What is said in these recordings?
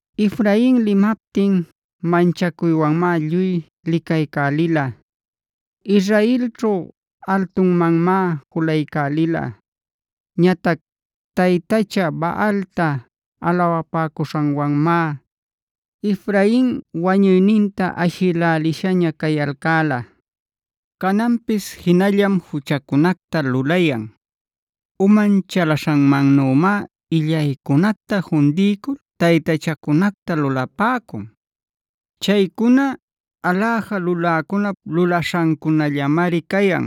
Efrain limaptin manchacuywanmá lluy licaycälila. Israelćhu altumanmá julaycälila. Ñatac taytacha Baalta alawapäcuśhanwanmá Efrain wañuyninta ashïlälishaña cayalcäla. Cananpis jinallam juchacunacta lulayan; uman chalaśhanmannümá illaycunacta fundiycul taytachacunacta lulapäcun. Chaycuna aläja luläcunap lulaśhancunallamari cayan.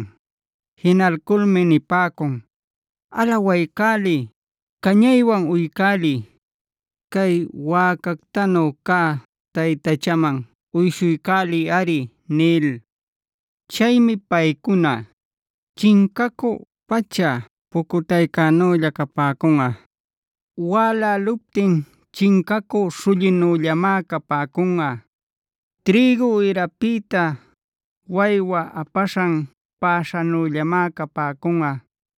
Jinalculmi nipäcun: “Alawaycäliy; cañaywan uycäliy. Cay wäcactanu cä taytachaman uyshuycäliyꞌari” nil. Chaymi paycuna, chincacü pacha-pucutaycänüllaa capäcunꞌa. Wäläluptin chincacü śhullinüllamá capäcunꞌa. Trïgu ïrapïta waywa apaśhan päśhänüllamá capäcunꞌa.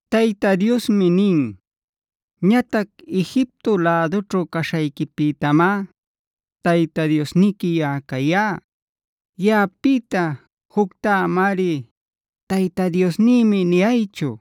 Tayta Diosmi nin: “Ñatac Egipto lädućhu caśhayquipïtamá Tayta Diosniqui yaꞌa cayá. Yaꞌapïta juctá amari ‘Tayta Diosnïmi’ niyaychu.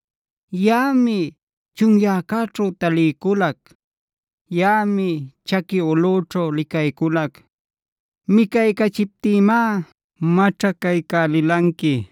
“Yaꞌami chunyäcäćhu taliyculac. Yaꞌami chaqui ulꞌüćhu licayculac. Micaycachiptïmá maćhacaycälilanqui.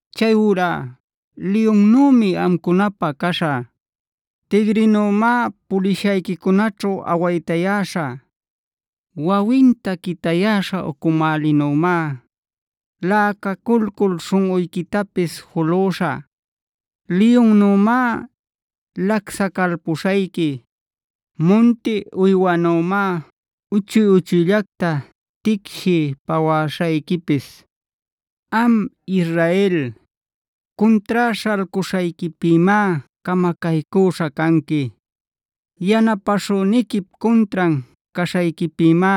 Chayurá liyunnümi amcunapä caśhä; tigrinümá pulishayquicunäćhu awaytayäśhä. Wawinta quitayäśha ucumälinümá läcaculcul śhunꞌuyquitapis julüśhä. Liyunnümá lacsacalpuśhayqui; munti uywanümá uchuy-uchuyllacta ticshiy pawäśhayquipis. “Am Israel, cuntrá śhalcuśhayquipïmá camacaycüśhä canqui. Yanapäśhüniquip cuntran caśhayquipïmá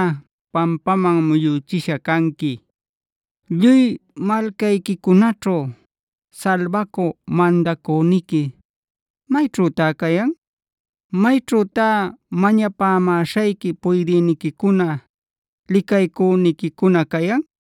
pampaman muyüchisha canqui. Lluy malcayquicunaćhu salbacü mandacüniqui, ¿mayćhütá cayan?e ¿Mayćhütá mañapämäśhayqui puydïniquicuna, licaycüniquicuna cayan?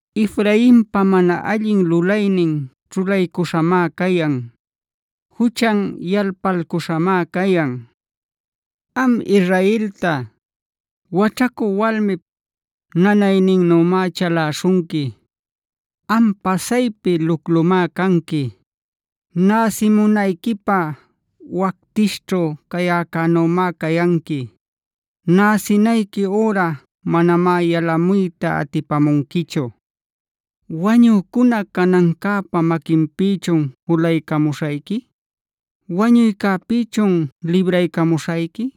“Efrainpa mana allin lulaynin ćhulaycuśhamá cayan. Juchan yalpalcuśhamá cayan. Am Israelta, waćhacü walmip nanayninnümá chalaśhunqui. Am pasaypi luclumá canqui. Näsimunayquipä wactishćhu cayäcänümá cayanqui. Näsinayqui üra manamá yalamuyta atipamunquichu. “¿Wañücuna canancäpa maquinpïchun julaycamuśhayqui? ¿Wañuycäpïchun libraycamuśhayqui?h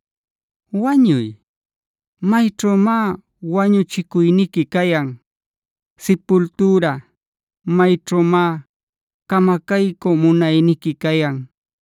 Wañuy, ¿mayćhümá wañuchicuyniqui cayan? Sipultüra, ¿mayćhümá camacaycü munayniqui cayan?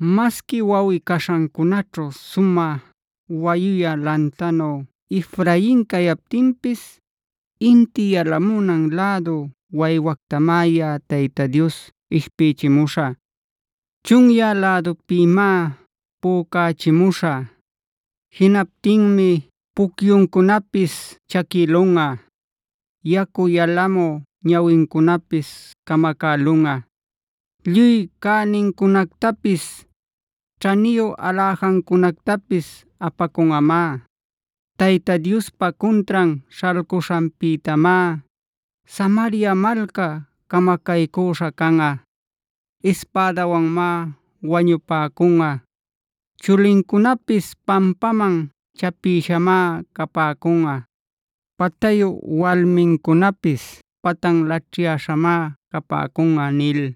Masqui wawꞌi-caśhancunaćhu sumä wayuyä lantanu Efrain cayaptinpis inti yalamunan lädu waywactamá yaꞌa Tayta Dios ishpïchimuśhä. Chunyä lädupïmá pücachimuśhä. Jinaptinmi pucyuncunapis chaquïlunꞌa; yacu yalamü ñawincunapis camacälunꞌa. Lluy cänincunactapis, ćhaniyu aläjancunactapis apacunꞌamá. Tayta Diospa cuntran śhalcuśhanpïtamá Samaria malca camacaycüśha canꞌa. Ispädawanmá wañupäcunꞌa. Chulincunapis pampäman chapïśhamá capäcunꞌa. Patayu walmincunapis patan laćhyäśhamá capäcunꞌa” nil.